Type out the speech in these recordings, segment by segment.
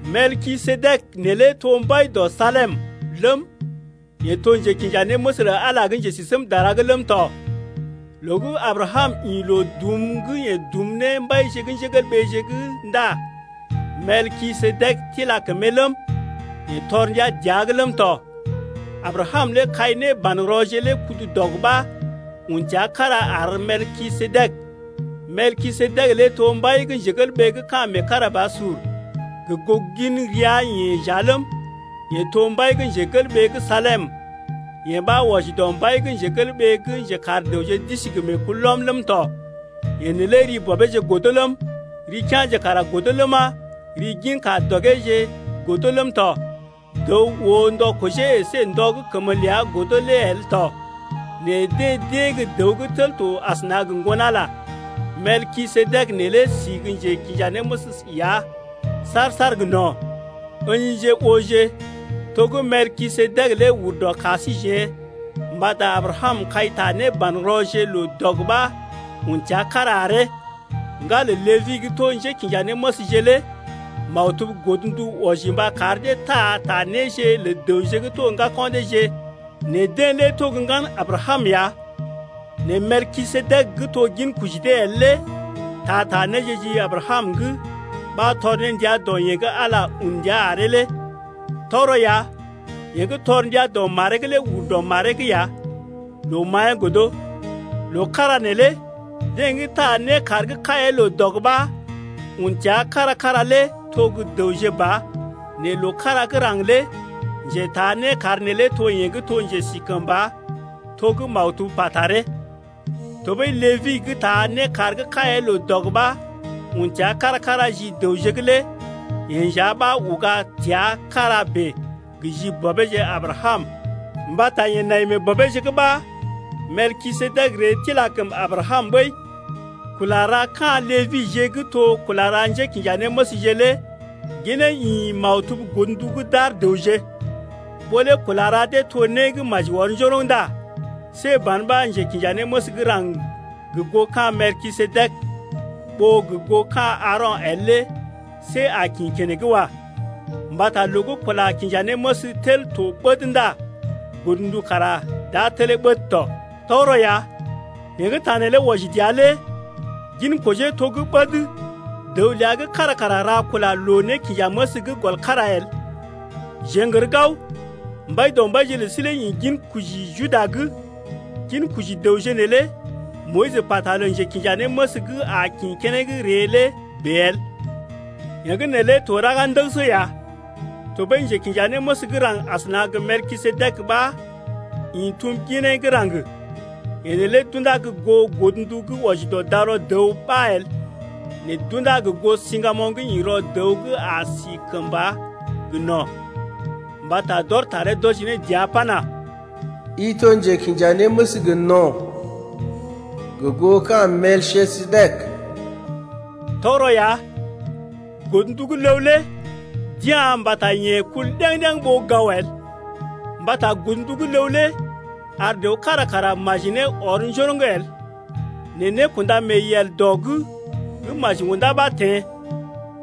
Melkisedek neelé to mbai dɔ Salem ləm, yeḛ to njekinjanéməs lə Ala gə́ Njesisémdara’g ləm tɔ. Loo gə́ Abrakam ḭ loo dum gə́ yeḛ dum ne mbaije’g ndá Melkisedek tila kəmee ləm, yeḛ tɔr ndia dəa’g ləm tɔ. Abrakam lé kai nébanrɔje lé kudu dɔg ɓa un təa kára ar Melkisedek. Melkisedek lé to mbai gə́ ka̰ meekarabasur gə goo gin ria-yeḛ nja ləm, yeḛ to mbai gə́ Salem, yee ɓa wɔji dɔ mbai gə́ njekar dəwje d’isi gə meekulɔm ləm tɔ. Yeḛ neelé bɔbeeje godo ləm, kea̰je kara godo ləma, gin ka-dɔgeje godo ləm tɔ. Dəw oo ndɔ kojee əsé ndɔ gə́ kəmə ləa godo lé el tɔ. Nɛ deḛ d’ée gə́ dəw gə́ tel to asəna gə Ŋgon-Ala ya. Melkisedek neelé sí gə́ njekinjanéməs ya saar-saar gə no̰. Ǝ̰jije ooje to gə́ Melkisedek lé ur dɔ ka síjeḛ mbata Abrakam kai ta nébanrɔje loo dɔg ɓa un təa kára aree. Ŋgalə Lébi gə́ to njékinjanéməsje lé maktub godndu wɔji mba kar dee taa ta néje lə dəwje gə́ to ŋgako̰ deeje nɛ deḛ lé to gə́ ŋgan Abrakam ya. Nɛ Melkisedek gə́ to ginkoji dee el lé taa ta néje ji Abrakam’g ɓa tɔr ne ndia dɔ yeḛ gə́ Ala tɔr ndia dəa’g lé ɓəi. Tɔgərɔ ya, yeḛ gə́ tɔr ndia dɔ maree’g lé ur dɔ maree’g ya, loo maḭyee godo. Loo kára neelé deḛ gə́ taa nékar gə́ kaiee loo dɔg ɓa un təa kára-kára lé to gə́ dəwje ba nɛ loo kára gə́ raŋg lé njetaa nékar neelé to yeḛ gə́ to njesikəmba to gə́ maktub pa taree lé. Tɔɓəi Lébi gə́ taa nékar gə́ kaiee loo dɔg ɓa un təa kára-kára ji dəwje’g lé yeḛ nja ɓa uga təa kára bèe gə ji bɔbeeje Abrakam mbata yeḛ nai mee bɔbeeje’g ɓa Melkisedek ree tila kəm Abrakam ɓəi. Kula ra ka̰ Lebije gə́ to kula ra njékinjanéməsje lé ginee ḭ maktub godndu gə́ d’ar dəwje. Ɓó lé kula ra dee to né gə́ maji ɔr njoroŋ ndá see ban ɓa njekinjanéməs gə́ raŋg gə goo ka̰ Melkisedek ɓó gə goo ka̰ Aaro̰ el lé see a kḭ keneŋ wa. Mbata loo gə́ kula kinja néməs tel to ɓəd ndá godndu kara d’a telee ɓəd tɔ. Tɔgərɔ ya, yeḛ gə́ ta neelé wɔji dəa lé ginkojee to gə́ ɓəd, dəw ləa gə́ kára kara ra kula loo-nékinjaməs’g gɔl kára el. Jeḛ n’gər gao, Mbaidɔmbaije lə sí lé ḭ ginkoji Juda’g, ginkoji dəwje neelé Moyis pata lə njekinjanéməs gə́ a kḭ keneŋ ree lé bèe el. Yee gə́ neelé to raga ndəgəsə ya. Tɔɓəi njekinjanéməs gə́ raŋg asəna gə Melkisedek ɓa ḭ tum ginee gə́ raŋg. Yeḛ neelé d’undá gə goo godndu gə́ wɔji dɔ darɔ dəw ɓa el, nɛ d’undá gə goo siŋgamoŋ gə́ ḭ rɔ dəw gə́ a si kəmba gə no̰. Mbata d’ɔr taree d’wɔji ne dəa pana: I to njekinjanéməs gə no̰, Gə goo ka̰ Melkisedek. Tɔgərɔ ya, godndu gə́ ləw lé d’ya̰ mbata yee kul ɗəŋ-ɗeŋ ɓó gao el. Mbata godndu gə́ ləw lé ar dəw kára kara maji ne ɔr njoroŋ el. Nɛ nékunda mee yel dɔ’g gə́ maji undá ɓa teḛ,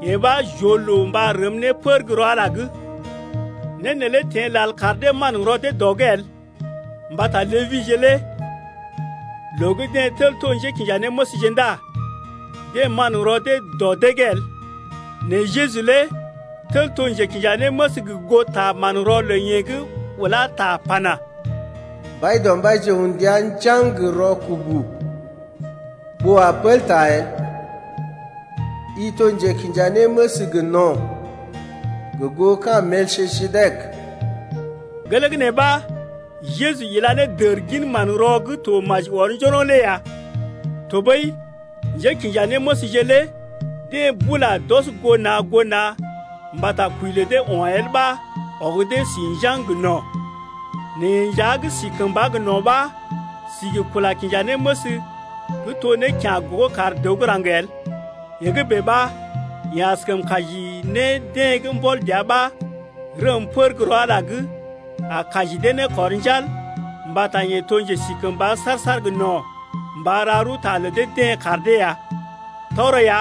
yee ɓa j’oo loo mba rəm ne pər gə́ rɔ Ala’g. Né neelé teḛ lal kar dee manrɔ dee dɔ’g el. Mbata Lebije lé loo gə́ deḛ tel to njékinjanéməsje ndá deḛ manrɔ dee dɔ dee’g el. Nɛ Jeju lé tel to njekinjanéməs gə goo ta manrɔ lə yeḛ gə́ ulá ta pana: Mbaidɔmbaije un ndia njaŋg gə rɔkubu ɓó a pəl ta el. I to njekinjanéməs gə no̰, gə goo ka̰ Melkisedek. Gelee gə́ nee ɓa Jeju ila ne dər gin manrɔ gə́ to maji ɔr njoroŋ lé ya. Tɔɓəi, njékinjanéməsje lé deḛ bula d’ɔs goo na̰ goo na̰ mbata kwəi lə dee o̰ el ɓa ɔg dee si njaŋg gə no̰. Nɛ yeḛ nja gə́ si kəmba gə no̰ ɓa si gə kula kinja néməs gə́ to né kya̰ gogo kar dəw gə́ raŋg el. Yee gə́ bèe ɓa, yeḛ askəm kaji ne deḛ gə́ mbɔl dəa ɓa rəm pər gə́ rɔ Ala’g lé, a kaji dee ne kɔr njal mbata yeḛ to njesikəmba saar-saar gə no̰ mba ra rəwta lə dee-deḛ kar dee ya. Tɔgərɔ ya,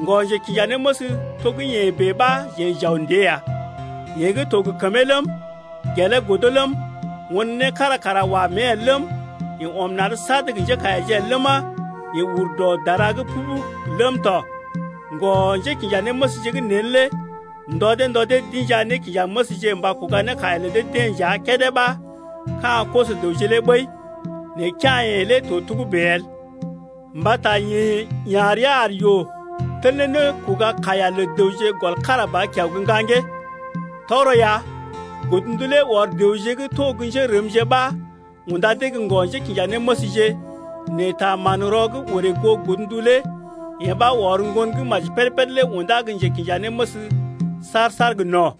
ŋgɔ-njekinjanéməs to gə́ yeḛ bèe ɓa jeḛ j’aw ndée ya, yeḛ gə́ to gə kəmee ləm, gelee godo ləm, won né kára kara wa mée el ləm, yeḛ ɔm na̰’d sad gə njékaiyaje el ləma, yeḛ ur dɔ dara’g pubug ləm tɔ. Ŋgɔ-njékinjanéməsje gə́ neen lé ndɔ dee ndɔ dee d’inja nékinjanéməsje mba kuga ne kaiya lə dee-deḛ nja kédé ɓa ka̰ koso-dəwje lé ɓəi. Nɛ kea̰-yeḛ lé to togə́bè el. Mbata yeḛ ya̰ rəa ar yoo tel ne nékoga-kaiya lə dəwje gɔl kára ba kiao gə́ ŋgaŋgee. Tɔgərɔ ya, godndu lé ɔr dəwje gə́ to gə́ njérəmje ɓa unda dee gə ŋgɔ-njékinjanéməsje, nɛ ta manrɔ gə́ orè goo godndu lé yee ɓa ɔr Ŋgon gə́ maji péd-péd lé undá gə́ njekinjanéməs saar-saar gə no̰.